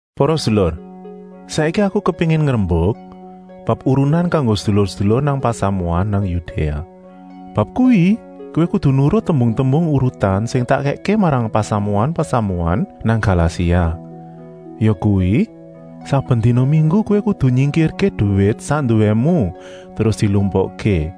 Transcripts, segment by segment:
Para sedulur, saiki aku kepéngin ngrembuk bab urunan kanggo sedulur-sedulur nang pasamuan nang Yudéa. Bab kuwi kowé kudu nurut tembung-tembung urutan sing tak kèkké marang pasamuan-pasamuan nang Galasia. Yakuwi, saben dina minggu kowé kudu nyingkirké duwit sak nduwému terus dilumpukké.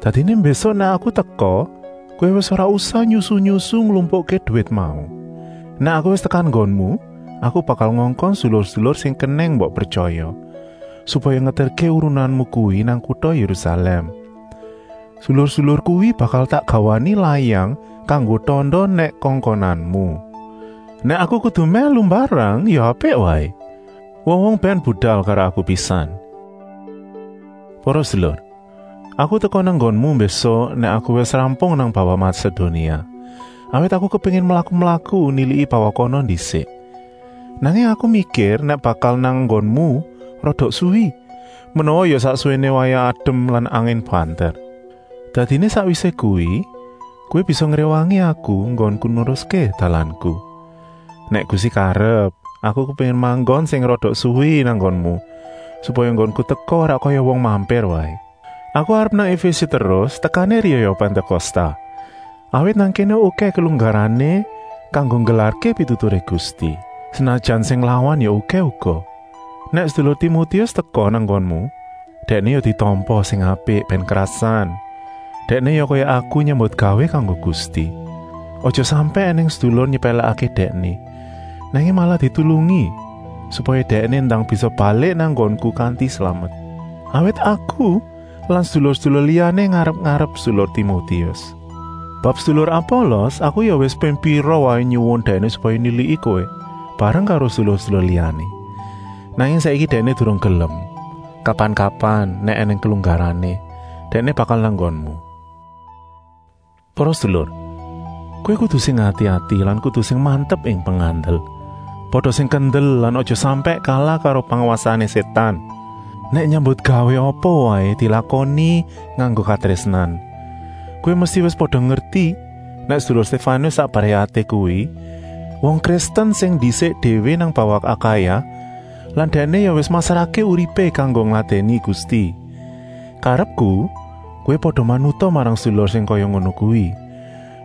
Dadiné mbésuk, nèk aku teka, kowé wis ora usah nyusu-nyusu nglumpukké duwit mau. Nèk aku wis tekan nggonmu, aku bakal ngongkon sedulur-sedulur sing kenèng mbok pretyaya, supaya ngeterké urunanmu kuwi nang kuta Yérusalèm. Sedulur-sedulur kuwi bakal tak gawani layang kanggo tanda nèk kongkonanmu. Nèk aku kudu mèlu mbarang, ya apik waé. Wong-wong bèn budal karo aku pisan. Para sedulur, aku teka nang nggonmu mbésuk nèk aku wis rampung nang bawah Masedonia, awit aku kepéngin mlaku-mlaku niliki bawah kana ndisik. Nanging aku mikir nèk bakal nang nggonmu rada suwi, menawa ya sak suwéné wayah adem lan angin banter. Dadiné sakwisé kuwi, kowé bisa ngréwangi aku enggonku neruské dalanku. Nèk Gusti karep, aku kepéngin manggon sing rada suwi nang nggonmu, supaya enggonku teka ora kaya wong mampir waé. Aku arep nang Efése terus tekané riyaya Pantékosta, awit nang kéné okèh kelunggarané kanggo nggelarké pituturé Gusti, senajan sing nglawan ya okèh uga. Nèk sedulur Timotius teka nang nggonmu, dèkné ya ditampa sing apik bèn krasan. Dèkné ya kaya aku nyambutgawé kanggo Gusti. Aja sampèk ènèng sedulur nyepèlèkké dèkné, nanging malah ditulungi supaya dèkné ndang bisa balik nang nggonku kanti slamet, awit aku lan sedulur-sedulur liyané ngarep-arep sedulur Timotius. Bab sedulur Apolos, aku ya wis ping pira waé nyuwun dèkné supaya niliki kowé, bareng karo sedulur-sedulur liyané. Nanging saiki dèkné durung gelem. Kapan-kapan, nèk ènèng kelunggarané, dèkné bakal nang nggonmu. Para sedulur, kowé kudu sing ati-ati lan kudu sing mantep ing pengandel. Pada sing kendel lan aja sampèk kalah karo pangwasané Sétan. Nèk nyambutgawé apa waé, dilakoni nganggo katrésnan. Kowé mesti wis pada ngerti nèk sedulur Stéfanus sak brayaté kuwi wong Kristen sing ndisik déwé nang bawah Akaya lan dèkné ya wis masrahké uripé kanggo ngladèni Gusti. Karepku, kowé pada manuta marang sedulur sing kaya ngono kuwi,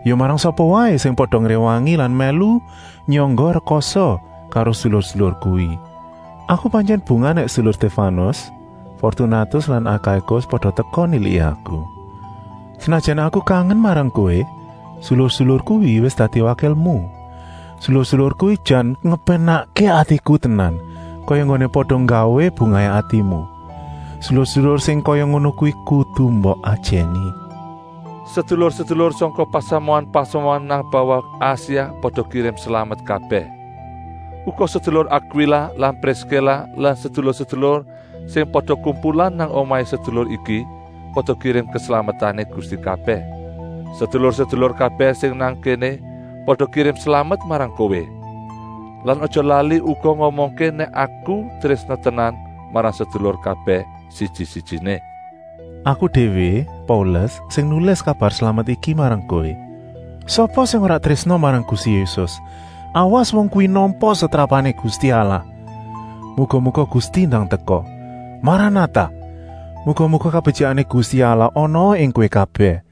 ya marang sapa waé sing pada ngréwangi lan mèlu nyangga rekasa karo sedulur-sedulur kuwi. Aku pantyèn bungah nèk sedulur Stéfanus, Fortunatus lan Akaikus pada teka niliki aku. Senajan aku kangen marang kowé, sedulur-sedulur kuwi wis dadi wakilmu. Sedulur-sedulur kuwi jan ngepénakké atiku tenan, kaya enggoné pada nggawé bungahé atimu. Sedulur-sedulur sing kaya ngono kuwi kudu mbok ajèni. Sedulur-sedulur sangka pasamuan-pasamuan nang bawah Asia pada kirim slamet kabèh. Uga sedulur Akwila lan Priskila lan sedulur-sedulur sing pada kumpulan nang omahé sedulur iki pada kirim keslametané Gusti kabèh. Sedulur-sedulur kabèh sing nang kéné pada kirim slamet marang kowé. Lan aja lali uga ngomongké nèk aku trésna tenan marang sedulur kabèh siji-sijiné. Aku déwé, Paulus, sing nulis kabar slamet iki marang kowé. Sapa sing ora trésna marang Gusti Yésus, awas wong kuwi nampa setrapané Gusti Allah! Muga-muga Gusti ndang teka. Maranatah! Muga-muga kabetyikané Gusti Allah anaa ing kowé kabèh.